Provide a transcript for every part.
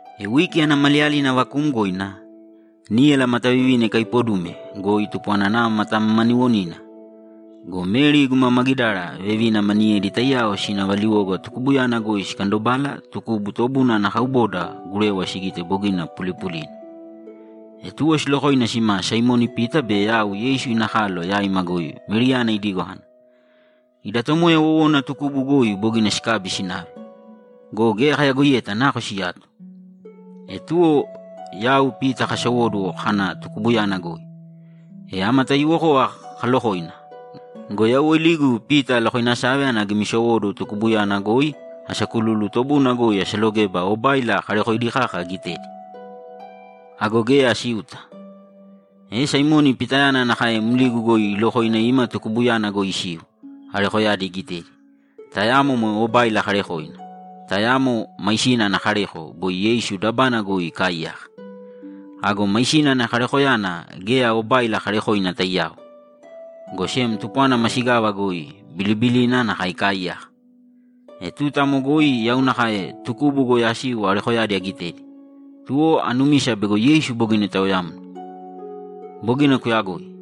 E wiki ana maliyalina vakuumgoina, níyala matavivina ikaipodume goi tupwana nava matamamaniwonina go, Meri guma Magidara vevina maniyedi taiyao sina valiwoga tukubuyana goi sikandobala tukubu tobuna ana kauboda gurewa sigite bogina pulipulina. E tuwo silokoina sima Saimoni Pita be yau Yeisu ina kalo yaima goi Meriyana idigo kana, ‘Ida Tomoya wowona tukubu goi bogina sikabi sinave go, geya kayagoiyeta nako siyato.’ E tuwo yau Pita kasowóduwo kana tukubuyana goi. E ama taiyuwokova kaalokoina go, yau woiligu Pita alokoinasave ana agimisowóduwo tukubuyana goi asakululu tobuna goi asalogeba obáila karekoidi kaka agitedi. Ago geya asiuta. E Saimoni Pitayana nakae mligu goi ilokoina ima tukubuyana goi isiu, arekoyadi igitedi, tayamo moe obáila karekoina, tayamo máisina ana kareko boi Yeisu dabana goi ikaaiyaka. Ago máisina ana karekoyana geya obáila karekoina taiyao, go sem tupwana masigava goi bilibilina nakae ikaaiyaka. E tuta amo goi yau nakae tukubu goi asiu arekoyadi agitedi, tuwo anumisa bego Yeisu bogina itaoyamna. Bogina kuyagoi,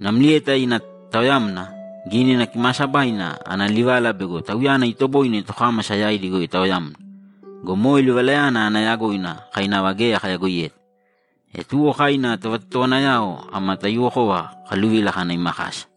namlieta ina taoyamna, Gínina Kimaasabaina ana livala bego Tauyana itoboine tokámasa yaidi goi itaoyamna go, moe livalayana ana yagoina kai nava geya kayagoiyeta. E tuwo kai ina tovatotowanayao ama taiyuwokova kakaluvila kana ima kasa.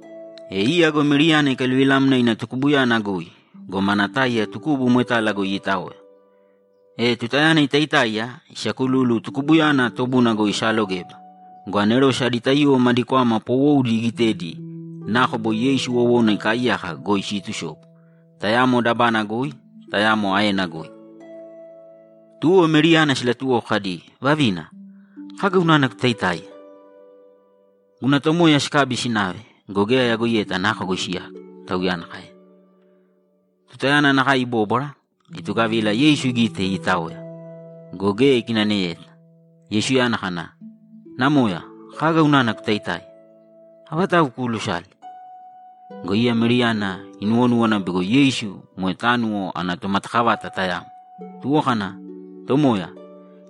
E iya go Meriyana ikaluvilamna ina tukubuyana goi go, mana táiya tukubu moetala goi iitaoya. E tutayana itaitáiya, isakululu tukubuyana tobuna goi isaalogeba go, anerose adi taiyuwo madi kwama poowoudi igitedi nako boi Yeisu wowona ikaaiyaka goi siitusobu, tayamo dabana goi, tayamo aena goi. Tuwo Meriyana silatuwoko kadi, ‘Vavina, kaga unana kutaitáiya?’ ‘Guna Tomoya sikabi sinave go, geya ayagoiyeta nako goi siyato’, Tauyana kaena. Tutayana nakae ibóbwara, itugavila Yeisu igite iitaoya go, geya ikinaneyeta. Yeisuyana kana, ‘Namoya, kaga unana kutaitáiya? Avatau kuulusale?’ Go iya Meriyana inuwonúwana bego Yeisu moe tánuwo ana tomatakavata tayamo, tuwo kana, ‘Tomoya,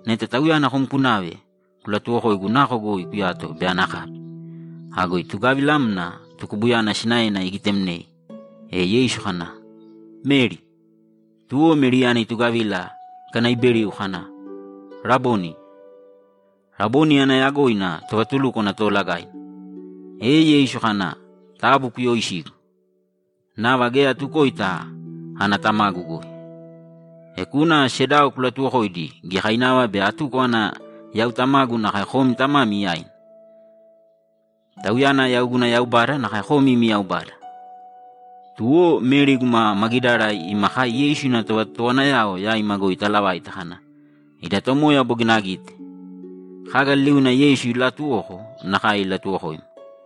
neta Tauyana kom kunave, kulatuwokōigu nako goi kuyato be ana akabi.’ Ago itugavilamna tukubuyana sinaena igitemnei. E Yeisu kana, ‘Meri!’ Tuwo Meriyana itugavila ikanaiberiu kana, ‘Raboni!’ Raboni ana yagoina Tovatulúkwana Toolagaina. E Yeisu kana, ‘Taabu kuyooisīgu. Nava geya atukoita ana Tamagu goi. E kūna sedao kulatuwokōidi giyakainava bei atuko ana yau Tamagu nakae komi Tamami yaina. Tauyana yau guna Yaubada nakae komi imi Yaubada.’ Tuwo Meri guma Magidara ima kai Yeisu ina tovatotowanayao yaima goi italavaita kana, ‘Ida Tomoya bogina agite!’ Kaga liliuna Yeisu ilaatuwoko nakae ilatuwokoima.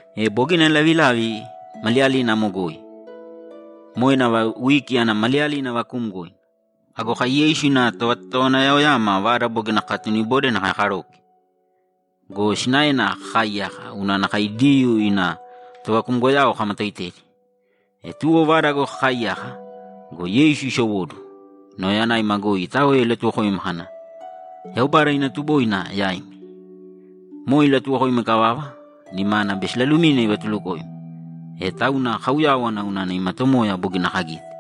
E bogina lavilavi maliyalina amo goi. Moe nava wiki ana maliyalina vakuumgoina. Ago kai Yeisu ina tovatotowanayama vada bogina kakatunibode nakae karoke go, sinaena kakaaiyaka unana kai Diyuu ima tovakumgoyao kamatoitedi. E tuwo vada goi kakaaiyaka go, Yeisu isowóduwo, nauyayanaima goi itaoya ilatuwokoima kana, ‘Yaubada ina tuboina yaimi.’ Moe ilatuwokoima ikavava, nimana be silalumina ivatulukoima. E tauna kauyáwana unana ima Tomoya bogina kagite.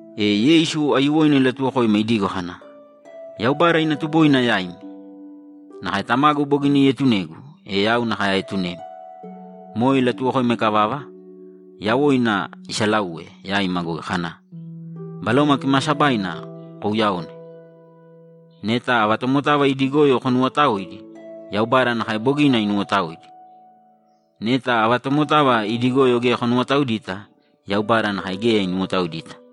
E Yeisu aiyuwoina ilatuwokoima idigo kana, ‘Yaubada ina tuboina yaimi! Nakae Tamagu bogina ietunegu, e yau nakae aetunemi.’ Moe ilatuwokoima ikavava, yawoina isalauwe yaima goi kana, ‘Baloma Kimaasabaina kouyaōne. Neta ava tomotava idi goyo konuwotaoidi, Yaubada nakae bogina inuwotaoidi. Neta ava tomotava idi goyo geya konuwotaoidita, Yaubada nakae geya inuwotaoidita.’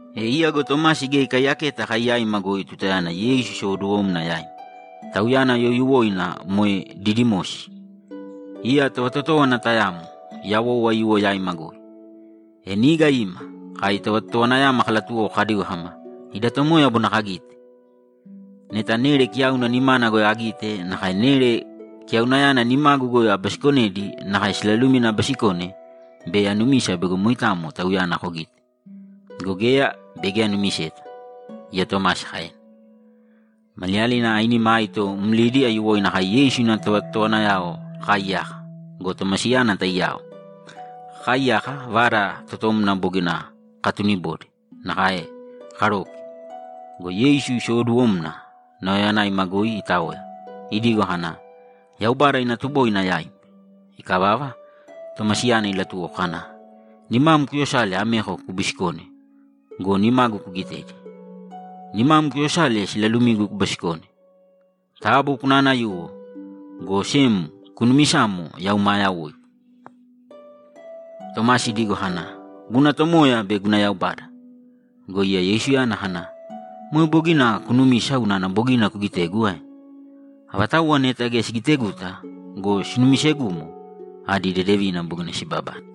E iya go Tomasi geya ikaiyaketa kai yaima goi tutayana Yeisu isowoduwomna yaima. Tauyana youyuwoina moe Didimosi. Iya tovatotówana tayamo yawou aiyuwo yaima goi. E niga ima, kai tovatotowanayama kalatuwoko kadigo kama, ‘Ida Tomoya bogina kagite!’ ‘Neta nere kiyauna nimana goi agitedi nakae nere kiyaunayana nimagu goi abisikonedi nakae silalumina abisikone, bei anumisa bego moitamo Tauyana kogite. Go geya, bei geya aanumisa’, iya Tomasi kaena. Maliyalina ainima aito mlidi aiyuwoina kai Yeisu ina tovatotowanayao kakaaiyaka go, Tomasiyana taiyao. Kakaaiyaka, vada totomna bogina kakatunibode nakae karoke go, Yeisu isowoduwomna, nauyayanaima goi itaoya, idigo kana, ‘Yaubada ina tuboina yaimi!’ Ikavava, Tomasiyana ilatuwoko kana, ‘Nimam kuyosāle ameko kubisikōne go, nimagu kugitēdi. Nimam kuyosāle silalumigu kubisikōne. Taabu kunaanayūwo, go sem kunumisāmo yau maa yawoigu!’ Tomasi idigo kana, ‘Guna Tomoya be guna Yaubada!’ Go iya Yeisuyana kana, ‘Moe bogina kunumise unana bogina kugitegu ae? Avatauwa neta geya sigiteguta go, sinumisegumo, adi dedevina bogina sibabane.’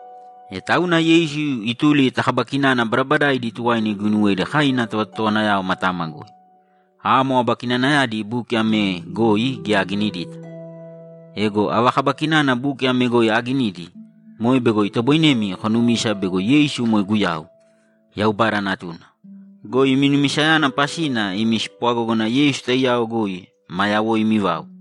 E tauna Yeisu ituli ta kaba kinana badabadaaidi tuwaina iguinuwedi kai ina tovatotowanayao matama goi. Amo aba kinanayadi buki ame goi geya aginidita. Ego ava kaba kinana buki ame goi aaginidi, moe bego itoboinemi konumisa bego Yeisu moe Guyau, Yaubada Natuna go, imi numisayana pasina imi spwagógana Yeisu taiyao goi maa yawoimi vau.